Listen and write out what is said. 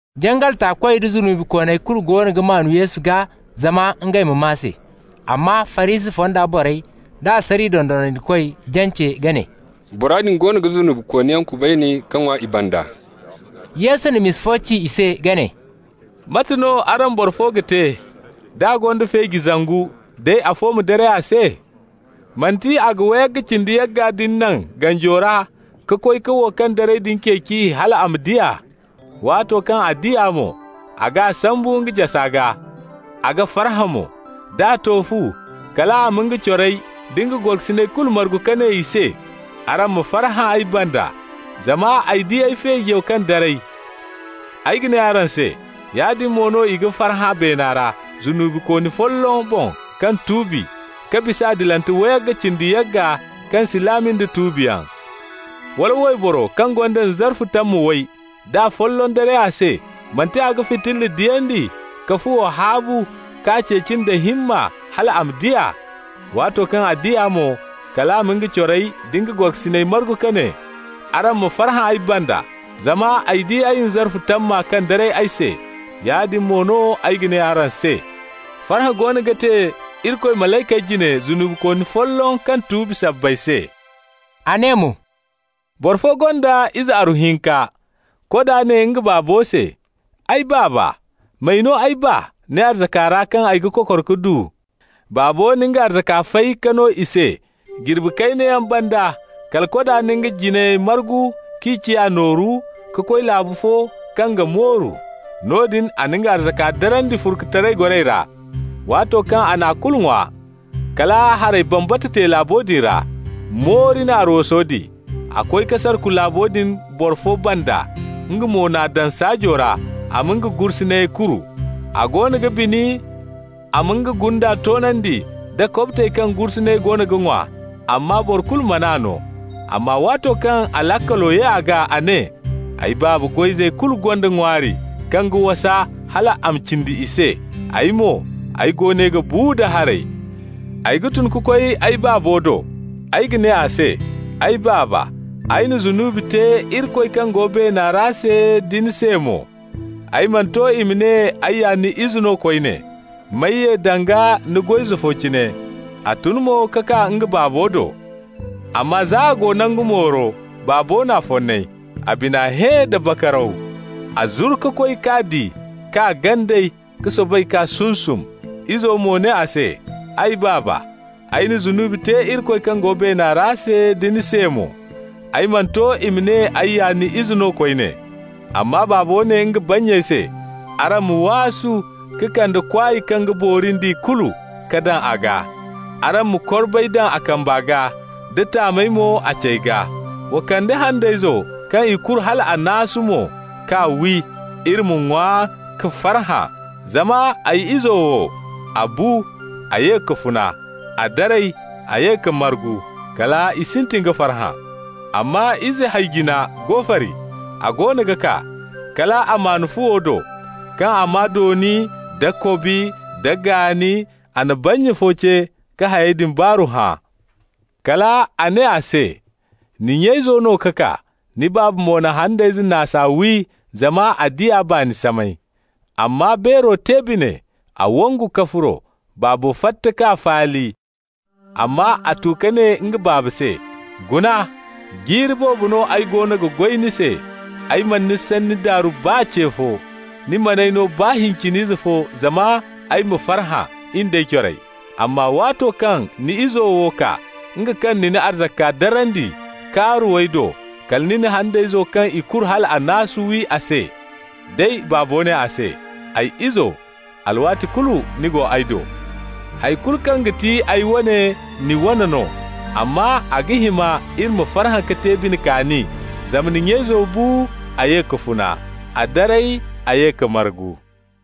Jangal taakoy da zunubikooney kulu goono ga maan Yesu gaa zama ngey ma maa se. Amma Farisi fonda borey da asariya dondonandikoy jance ka ne: «Bora din goono ga zunubikooniyaŋ kubayni ka ŋwa i banda.» Yesu na misa fo ci i se ka ne: «Mate no araŋ boro fo ga te, d'a gonda feeji zangu, day afo ma daray a se? Manti a ga wayga cindi yagga din naŋ ganjo ra ka koy ka wo kaŋ daray din ceeci hal a ma di a? Waato kaŋ a di a mo, a g'a sambu nga jasa gaa, a ga farhã mo. D'a to fu, kal a ma nga corey da nga gorokasiney kulu margu ka ne i se: ‹Araŋ ma farhã ay banda, zama ay di ay feejo kaŋ daray!› Ay ga ne araŋ se: Yaadin mo no i ga farhã beena ra zunubikooni folloŋ boŋ kaŋ tuubi, ka bisa adilante wayga cindi yagga kaŋ si laami nda tuubiyaŋ. Wala wayboro kaŋ gonda nzarfu tamma way, da afolloŋ daray a se, manti a ga fitilla diyandi ka fuwo haabu, k'a ceeci nda himma hal a ma di a? Waato kaŋ a di a mo, kal a ma nga corey da nga gorokasiney margu ka ne: ‹Araŋ ma farhã ay banda zama ay di ay nzarfu tamma kaŋ daray ay se.› Yaadin mo no ay ga ne araŋ se: farhã goono ga te Irikoy malaykey jine zunubikooni folloŋ kaŋ tuubi sabbay se.» A ne mo: «Boro fo gonda ize aru hinka. Koda ne nga baabo se: ‹Ay baaba, m'ay no ay baa ni arzaka ra kaŋ ay ga kokor ka du.› Baabo na nga arzaka fay ka no i se. Jirbi kayna yaŋ banda, kala koda na nga jinayey margu k'i ciya nooru, ka koy laabu fo kaŋ ga mooru. Noodin a na nga arzaka darandi furkutaray goray ra. Waato kaŋ a n'a kulu ŋwa, kala haray bambata te laabo din ra. Moori na arwaso di. A koy ka sarku laabo din boro fo banda, nga mo n'a daŋ saajo ra a ma nga gursuney kuru. A goono ga bini a ma nga gunda toonandi nda kobtey kaŋ gursuney goono ga ŋwa, amma boro kulu man'a no. Amma waato kaŋ a laakalo ye a gaa, a ne: ‹Ay baaba goy-izey kulu gonda ŋwaari kaŋ ga wasa hal a ma cindi i se, ay mo, ay go ne ga bu da haray! Ay ga tun ka koy ay baabo do. Ay ga ne a se: Ay baaba, ay na zunubi te Irikoy kaŋ go beena ra se da ni se mo. Ay mana to i ma ne ay ya ni ize no koyne. M'ay ye danga ni goy-ize fo cine.› A tun mo ka kaa nga baabo do. Amma za a go nangu mooro, baabo n'a fonnay. A bina hẽ da bakaraw. A zuru ka koy, k'a di k'a ganday, ka soobay k'a sunsum. Izo mo ne a se: ‹Ay baaba, ay na zunubi te Irikoy kaŋ go beena ra se da ni se mo. Ay mana to i ma ne ay ya ni ize no koyne.› Amma baabo ne nga bannyey se: ‹Araŋ ma waasu ka kande kwaay kaŋ ga boori nd'i kulu ka daŋ a gaa. Araŋ ma korbay daŋ a kamba gaa da taamey mo a cey gaa. Wa kande handayzo kaŋ i kuru hal a naasu mo k'a wi. Iri ma ŋwa ka farhã. Zama ay izo wo, a bu, a ye ka funa. A daray, a ye ka margu.› Kal i sintin ka farhã. Amma ize hay-jina go fari. A goono ga kaa, kal a maan fuwo do. Kaŋ a maa dooni nda kobi nda gaani, a na bannya fo ce ka hayey din baaru hã. Kal a ne a se: ‹Ni nya izo no ka kaa. Ni baaba mo na handayze naasa wi zama a di a baani samay.› Amma beero te bine; a wangu ka furo. Baabo fatta k'a faali. Amma a tu ka ne nga baaba se: ‹Guna. Jiiri boobo no ay goono ga goy ni se. Ay mana ni sanni daaru baa ce fo. Ni man'ay no baa hincin ize fo zama ay ma farhã, in d'ay corey. Amma waato kaŋ ni izo wo kaa, nga kaŋ na ni arzaka darandi kaaruwey do, kala ni na handayzo kaŋ i kuru hal a naasu wi a se.› Day baabo ne a se: ‹Ay izo, alwaati kulu ni go ay do. Hay kulu kaŋ ga ti ay wane, ni wane no. Amma a ga hima iri ma farhã ka te bine kaani, zama ni nya izo bu, a ye ka funa. A daray, a ye ka margu.›»